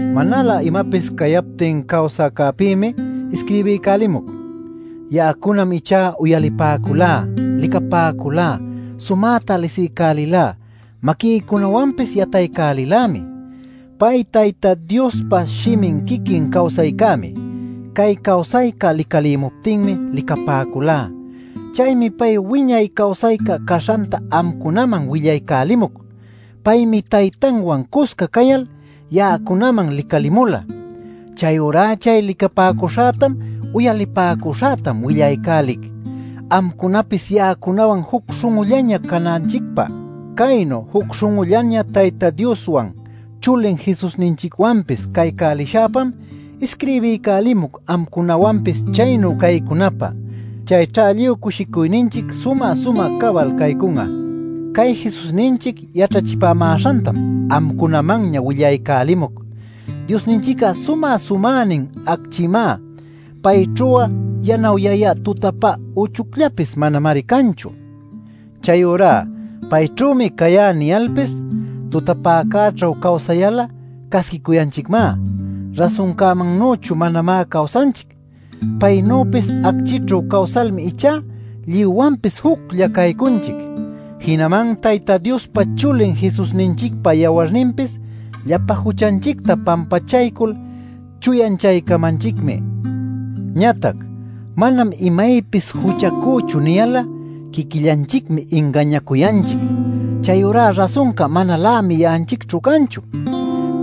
Manalä imapis cayaptin cawsäcäpïmi isquirbiycälimuc. Ya'acunam ichá uyalipäculá, licapäculá, sumäta lisiycälilá, maquïcunawanpis yataycälilämi. Pay Tayta Diospa Shimin quiquin cawsaycämi. Cay cawsayca licalimuptinmi licapäculá. Chaymi pay wiñay cawsayca caśhanta amcunaman willaycälimuc. Paymi Taytanwan cusca cayal, ya'acunaman licalimula. Chayurá chay licapäcuśhätam uyalipäcuśhätam willaycälic, amcunapis ya'acunawan juc śhun'ullaña cananchicpä. Caynu juc śhun'ullaña Tayta Dioswan chulin Jesusninchicwanpis caycälishäpam isquirbiycälimuc amcunawanpis chaynu caycunapä. Chayćha lluy cushicuyninchic sumä-sumä cabal caycun'a. Cay Jesusninchic yaćhachipämäśhantam amcunamanña willaycälimuc: Diosninchic'a sumä-sumänin acchimá; payćhu'a yanawyayä tutapä uchucllapis manamari canchu. Chayurá “Payćhümi cayá” niyalpis tutapäcäćhu cawsayal'a casquicuyanchicmá; rasuncämannüchu manamá cawsanchic. Paynüpis acchïćhu cawsalmi ichá lluywanpis juclla caycunchic. Jinaman Tayta Diospa Chulin Jesusninchicpa yawarninpis llapa juchanchicta pampachaycul chuyanchaycamanchicmi. Ñatac “Manam imaypis juchacüchu” niyal'a, quiquillanchicmi ingañacuyanchic. Chayurá rasunca manalämi ya'anchicćhu canchu.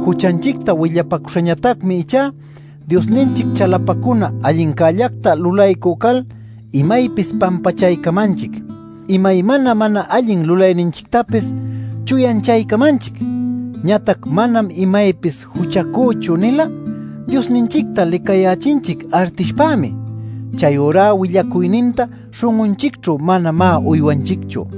Juchanchicta willapacuśhañatacmi ichá Diosninchic chalapacuna allincällacta lulaycü cal imaypis pampachaycamanchic, imaymana mana allin lulayninchictapis chuyanchaycamanchic. Ñatac “Manam imaypis juchacüchu” nil'a Diosninchicta licayächinchic artishpämi. Chayurá willacuyninta śhun'unchicćhu manamá uywanchicchu.